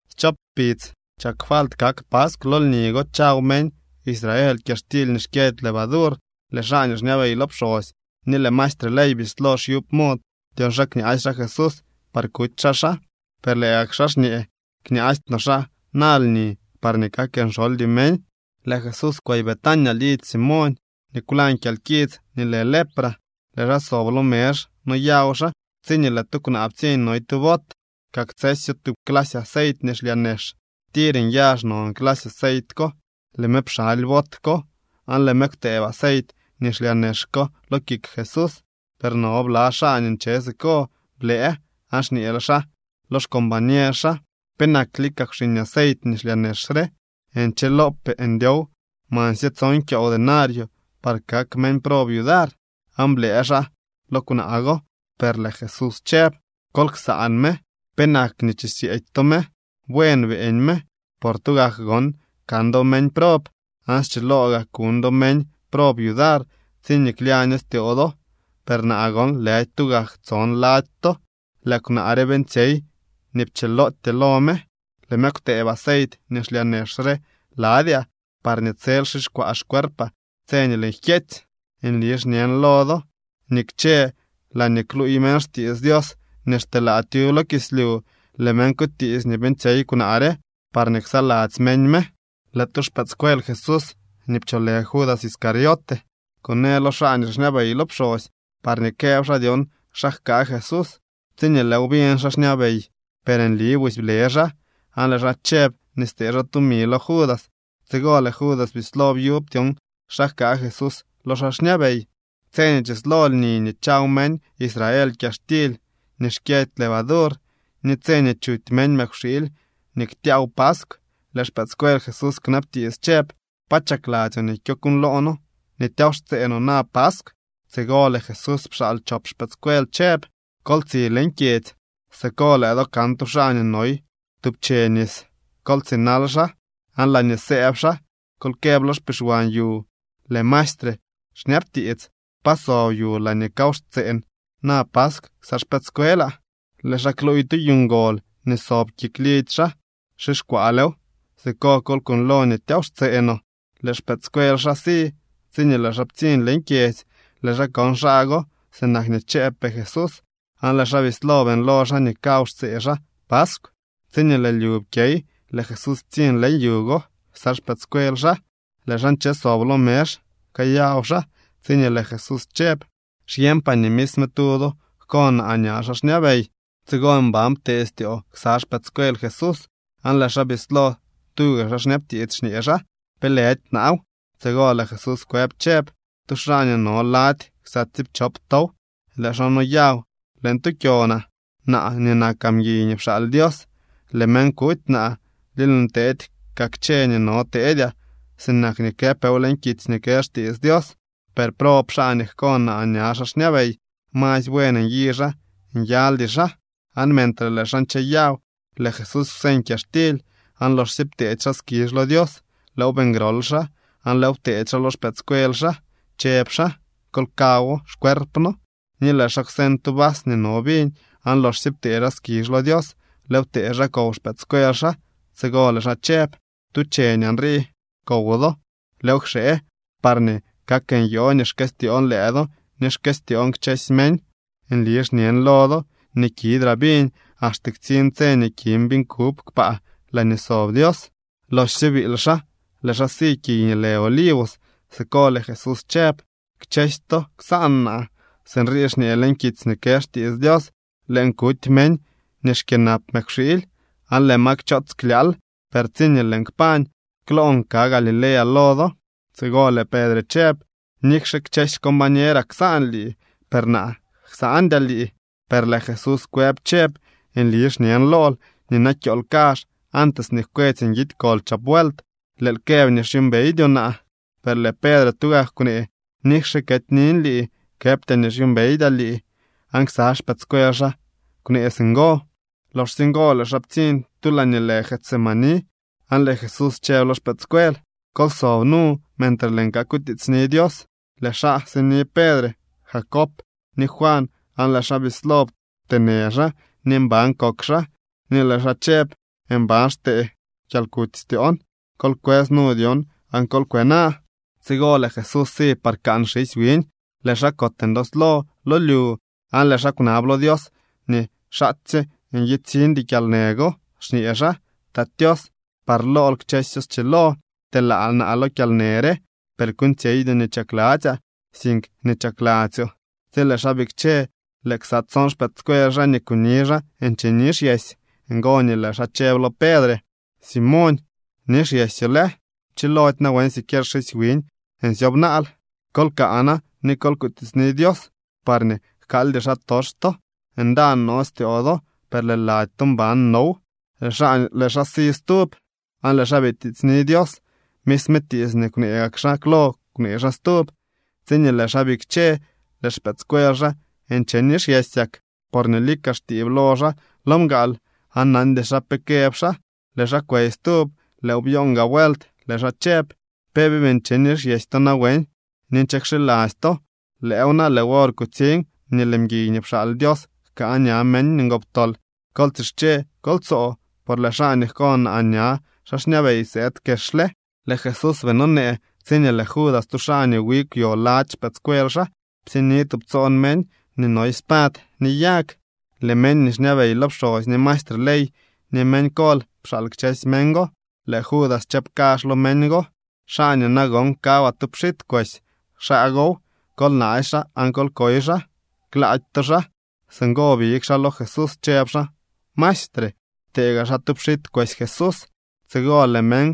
Schop kpidz chak falt kak paskw. Lo lni go chaw meñ Israel kyaxtily nii xkyëdy levadur. Lëë xaa nii xñabey lo pxosy ni lëë maestre ley bislo xyub mod dyon xa kñaasy xaa Jesús par kuty xaa xaa. Per lëë gak xaa xñee: —Kñaasty no xaa na lni parñee kak nxoldy meñ. Lëë Jesús kwey Betania lidzy Simoñ nii kwlañ kyalkits nii lë lepra. Lëë xaa sob lo mezh noyaw xaa tsiñee lëë tu kwnaa ptsiñ noy tu bot. Kaktsësyo tub clasy aceit nii xlyaa nex. Tir nyazh non clasy aceit ko. Lëë me pxaly bot ko aan lëë me kwtëëb aceit nii xlyaa nex ko lo kik Jesús. Per no bla xaa nii nche siko blëë aan xñee xaa lo xcombañer xaa: —¿Penak lika kwxiñ aceit nii xlyaa nex re? Nchilopee ndyow mansye tson kyoow denario par kak meñ prob yudar. Aan blëë xaa lo kwnaa go. Per lëë Jesús chëb: —Kol ksaan me. ¿Penak chisyeedy to me? Buen beeñ me. Por tugak gon kan do meñ prob, aan schiloo gaa kuñ do meñ prob yudar tsiñee klyaño styoo do, per naa gon lëdy tugak tson lady to. Lëë kwnaa re beeñtsyey nii pchilootyee lo me. Lëë me kwtëëb aceit nii xlyaa nex re ladyaa parñee tsel xixkwaa xcuerpaa tse nii lëën jkyeetsy. Nli xñen lo do nii kchë laañee kluuy meñ xtiits Dios nii xteelaa tyub lo kislyu, lëë meñ kutiits nii beeñtsyey kwnaa re parñee ksaladzy meñ me. Lëë tu xpëëdscuel Jesús nii pcholë Judas Iscariote kunee lo xaa nii xñabey lo pxosy parñee këb xaa dyon xa jkaa Jesús. Tsiñee lëëw biñ xaa xñabey, per nli busy ble xaa, aan lëë xaa chëb nii stee xaa tumi lo Judas. Tsigo lëë Judas bislo byub dyon xa jkaa Jesús lo xaa xñabey. Tse nii chislo lni nii chaw meñ Israel kyaxtily nii xkyëdy levadur, ni tse nii chuty meñ mëkwxiily nii ktyaaw paskw, lëë xpëëdscuel Jesús kwnabtiits chëb: —¿Pa chakladzyoo nii kyokuuñloo noo nii tyaaw xtsee no na paskw? Tsigo lëë Jesús pxaal chop xpëëdscuel chëb xaa: —Kol tsi leñ kyedzy. Siko lëë do kan tu xaa nii noy tub che nis. Kol tsinal xaa, aan laañee sëëb xaa, kol këb lo xpixwan yu: “Lëë maestre xñabtiits: ¿Pa sob yu laañee kaw xtseen na paskw ksa xpëëdscuelaa?” Lëë xaa kluuy tu yu ngol nii sob kik lidzy xaa, xixkwaalew. Siko kol kuuñlo nii tyaaw xtsee no. Lëë xpëëdscuel xaa si. Tsiñee lëë xaa ptsiñ leñ kyedzy, lëë xaa kon xaa go sinak nii chëëbpee Jesús, aan lëë xaa bislo beeñlo xaa nii kaw xtsee xaa paskw. Tsiñee lëë lyu pkyey lëë Jesús ptsiñ leñ yu go ksa xpëëdscuel xaa. Lëë xaa nche sob lo mezh kayaw xaa, tsiñee lëë Jesús chëb: —Xyeñpaa nii misme tu do jko naa ña xaa xñabey. Tsigo mban ptee styoo ksa xpëëdscuel Jesús aan lëë xaa bislo tuga xaa xñabtiits xñee xaa: —¿Pe lëdy naaw? Tsigo lëë Jesús kwëb chëb: —Tu xaa nii no lady ksa tsiipchop tow. Lëë xaa noyaw leñ tu kyonaa. Naa nii nakaa mguiy nii pxaal Dios, lëë meñ kuty naa ni lëën teedy kaa kchë nii no teedyaa sinak nii këpeew leñ kitsy nii kë xtiits Dios. Per ¡brob xaa nii jko naa ña xaa xñabey! Masy buen nyi xaa nyaldy xaa. Aan mentre lëë xaa ncheyaw, lëë Jesús kwseñ kyaxtily, aan loxsye pteedy xaa skizh lo Dios, lëëw beeñ grol xaa aan lëëw pteedy xaa lo xpëëdscuel xaa chëb xaa: —Kol kawo, xcuerpno. Ni lëë xaa kwseñ tu vas nii no viñ, aan loxsye ptee xaa skizh lo Dios, lëëw ptee xaa kow xpëëdscuel xaa. Tsigo lëë xaa chëb: —Tu cheñaa nrii kow do. Lëëw kxee parñee kak nyoo nii xkëstyoon lëë do ni xkëstyoon kchësy meñ. Nli xñen lo do nii kidraa viñ axte ktsiñ tse nii kin viñ kub kpaa laañee sob Dios. Loxsye biily xaa lëë xaa si kiy nii lë Olivos. Siko lëë Jesús chëb: —Kchësy to ksaan naa. Sinrii xñee leñ kitsy nii kë xtiits Dios: “Lëën kuty meñ nii xkyënap mëkwxiily, aan lëë ma kchoots klyaal.” Per tsiñee lëën kpañ, kloon ka Galilea lo do. Tsigo lëë Pedre chëb: —Nikxe kchësy xcombañeraa ksaan lii, per naa ksandyaa lii. Per lëë Jesús kwëb chëb: —Nli xñen lool nii na kyool kazh, antes nii jkwetsy nguidy kol chop vuelt, lëël këb nii xyuumbeydyoo naa. Per lëë Pedre tugak kwnee: —Nikxe ketynin lii, këbtyaa nii xyuumbeydyaa lii. Aan ksa xpëëdscuel xaa kwnee singo. Loxsye ngo lëë xaa ptsiñ tu laañee lë Getsemaní, aan lëë Jesús chëb lo xpëëdscuel: —Kol sob nu mentre lëën kakutiitsni Dios. Lëë xaa sini Pedre, Jacob ni Juan, aan lëë xaa bislo pteenë xaa ni mban kok xaa, ni lëë xaa chëb: —Mban xtee kyalkuty styoon. Kol kwës nu dyon aan kol kwena. Tsigo lëë Jesús si par kaan xisy wiñ, lëë xaa kot ndooslo lo lyu, aan lëë xaa kwnab lo Dios nii xaatsye ntsiñdy kyalnë go, xñee xaa: —Tat Tios, par lool kchësyo xchilo. Pteelaa naa lo kyalnë re. Per kuuñtsyeydyoo nii chakladzyaa, sink nii chakladzyoo. Tsi lëë xaa bikche lëë ksa tson xpëëdscuel xaa nii kuni xaa nche nixyesy. Ngo nii lëë xaa chëb lo Pedre: —Simoñ, ¿nixyesyoo lë? ¿Pchilody nawen siquier xisy wiñ nsyob naal? Kol kaa na ni kol kutiitsni Dios parñee jkaaldy xaatox to. Ndaan no styoo do, per lëë lady to mban now. Lëë xaa si stub, aan lëë xaa bitiitsni Dios. Misme tiits nii kwnee gak xaa klo kwnee xaa stub. Tsiñee lëë xaa bikche, lëë xpëëdscuel xaa nche nixyesyak, porñee lika xtiib lo xaa lo mgaal. Aan nandy xaa pe këb xaa. Lëë xaa kwey stub. Lëëw byoon gaa vuelt. Lëë xaa chëb: —¿Pe bii nche nixyesy to nawen ni nche kxiladzy to? Lëëw na, lëë wor kutsiñ nii lëë mguiy nii pxaal Dios jkaa ña meñ ngoptol. Kol tsische, kol tsoo, por lëë xaa nii jko naa ña xaa xñabey sëëd kexle. Lëë Jesús bii nonee tsiñee lëë Judas, tu xaa nii wi kwyo lady xpëëdscuel xaa, ptsiñni tubtsoon meñ nii noy spad ni yag. Lëë meñ nii xñabey lo pxosy, ni maestre ley, ni meñ kol pxaal kchësy meñ go. Lëë Judas chëb kazh lo meñ go: —Xaa nii nagon kawaa tu pxit kwesy, xaa gow. Kol naasy xaa aan kol koy xaa. Klaady to xaa. Singo big xaa lo Jesús chëb xaa: —Maestre. Ptee gaa xaa tu pxit kwesy Jesús. Tsigo lëë meñ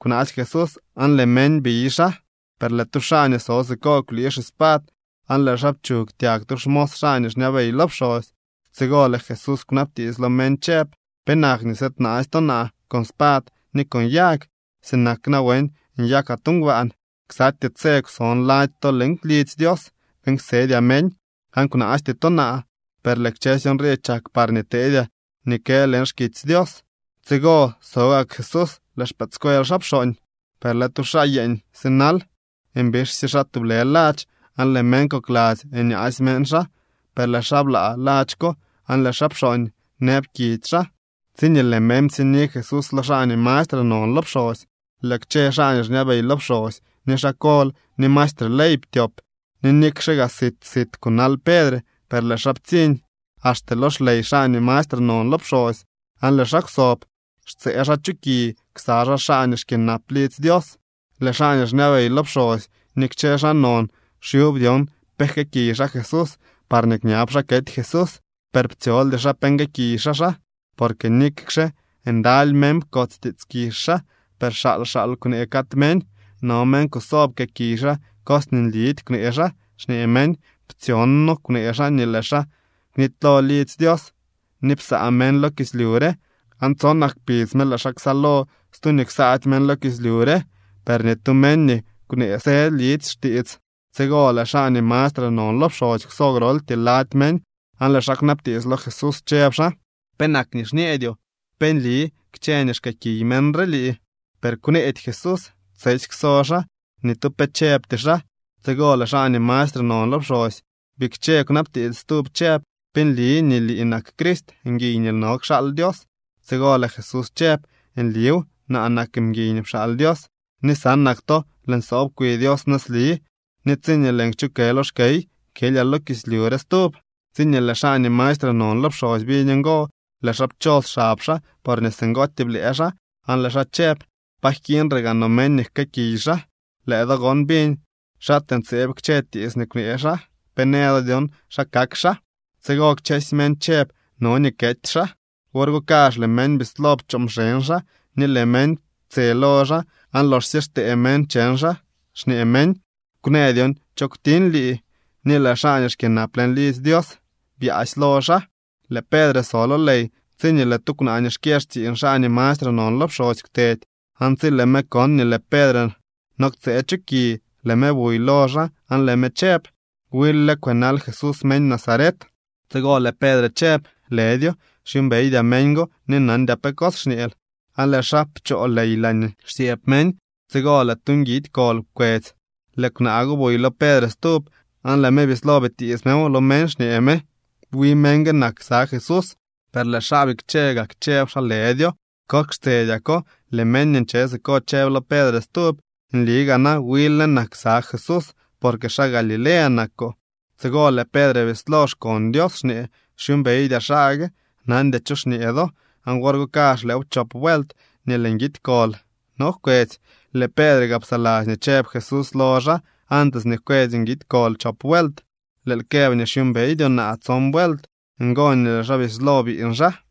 kwnaasy Jesús aan lëë meñ biy xaa. Per lëë tu xaa nii so siko kwlii xispad aan lëë xaa pchug tyag tu xmos xaa nii xñabey lo pxosy. Tsigo lëë Jesús kwnabtiits lo meñ chëb: —¿Penak nii sëëdnaasy to naa con spad ni con yag, sinak nawen nyakaa tu ngbaan? Ksatyee tse kwson lady to leñ lidzy Dios beeñ ksedyaa meñ, aan kwnaasty to naa. Per lëë kchësy nrii chak parñee teedyaa nii kë leñ xkitsy Dios. Tsigo so gak Jesús. Lëë xpëëdscuel xaa pxooñ. Per lëë tu xaa yeeñ sinal, mbixsye xaa tublë ladx, aan lëë meñ kokladzy nyaasy meñ xaa, per lëë xaa blaa ladx ko aan lëë xaa pxooñ nëb kidy xaa. Tsiñee lëë meñ ptsiñni Jesús lo xaa nii mastre non lo pxosy, lëë kchë xaa nii xñabey lo pxosy, ni xaa kol ni maestre ley ptyop. Ni nikxe gaa sit sit kunal Pedre, per lëë xaa ptsiñ axte lo xley xaa nii mastre non lo pxosy, aan lëë xaa kwsob xtsëë xaa chu ki ksa xaa xaa nii xkyënap lidzy Dios. Lëë xaa nii xñabey lo pxosy ni kchë xaa non xyub dyon pe jkëëkiy xaa Jesús parñee kñab xaa kety Jesús. Per ptsyoldy xaa pe nguëëkiy xaa xaa. Porque nikxe ndaly meñ pkots tiits kizh xaa, per xaal xaal kwnee cad meñ. No meñ kuso pkëëkiy xaa cos nii nlidy kwnee xaa, xñee meñ: —Ptsyon noo kwnee xaa nii lëë xaa knitylo lidzy Dios nii psaa meñ lo kislyu re aan tsonak kpidz me lëë xaa ksaalo stu nii ksaady meñ lo kislyu re. Per ni tu meñ nii kwnee së lidy xtiits. Tsigo lëë xaa nii mastre non lo pxosy kwso groltyee lady meñ aan lëë xaa kwnabtiits lo Jesús chëb xaa: —¿Penak nii xñeedyoo? ¿Pe nli kchë nii xkëëkiy meñ re lii? Per kwneedy Jesús. Tsesy kwso xaa. Ni tu pe chëbty xaa. Tsigo lëë xaa nii mastre non lo pxosy bikche kwnabtiits stub chëb: —¿Pe nli nii lii nak Crist, mguiy nii no kxaal Dios? Tsigo lëë Jesús chëb: —Nliw, naa nak mguiy nii pxaal Dios. Ni sanak to lëën sob kwi Dios nëzli, ni tsiñee lëën kchukë lo xkey kyelyaa lo kislyu re stub. Tsiñee lëë xaa nii mastre non lo pxosy biñ ngo, lëë xaa pchos xab xaa porñee singootyee blëë xaa aan lëë xaa chëb: —¿Pa jkiiñre gaa no meñ nii jkëëkiy xaa? Lëë do gon biñ xaatee ntseeb kchë tiits nii kwnee xaa. ¿Pe në do dyon xa kak xaa? Tsigo kchësy meñ chëb no nii kety xaa. Wor go kazh lëë meñ bislo pchoo mxeñ xaa, ni lëë meñ ptse lo xaa, aan loxsye xtee meñ cheñ xaa, xñee meñ: —¡Kwnë dyon cho kwtiñ lii! Ni lëë xaa nii xkyënap leñ lidzy Dios byaasy lo xaa. Lëë Pedre so lo ley tsiñee lëë tu kwnaa nii xkyë xtsiiñ xaa nii mastre non lo pxosy kwtedy. Aan tsi lëë me kon nii lëë Pedre no ktsëë chu ki, lëë me buy lo xaa aan lëë me chëb: —Wil lë kwënal Jesús meñ Nazaret. Tsigo lëë Pedre chëb: —Lëdyo, xyuumbeydyaa meñ go ni nandyaa pe cos xñeel. Aan lëë xaa pchoo ley laañee xsyëëb meñ. Tsigo lëë tu nguidy kol pkwetsy. Lëë kwnaa go buy lo Pedre stub aan lëë me bislo bitiits mew lo meñ xñee me: —Wi meñ gue nak ksa Jesús. Per lëë xaa bikche gak chëb xaa lëdyo. Kok xtsedyako lëë meñ nii nche siko chëb lo Pedre stub: —Nli gaa na wil lë nak ksa Jesús, porque xaa Galilea nakoo. Tsigo lëë Pedre bislo xkon Dios xñee: —Xyuumbeydyaa xaa gue. Nandyaa cho xñee do. Aan wor go kazh lëëw pchop vuelt nii lëë nguidy kol no jkwetsy, lëë Pedre gaa psaladzy nii chëb Jesús lo xaa: “Antes nii jkwetsy nguidy kol chop vuelt, lëël këb nii xyuumbeydyoo naa tson vuelt.” Ngo nii lëë xaa bislo biiñ xaa.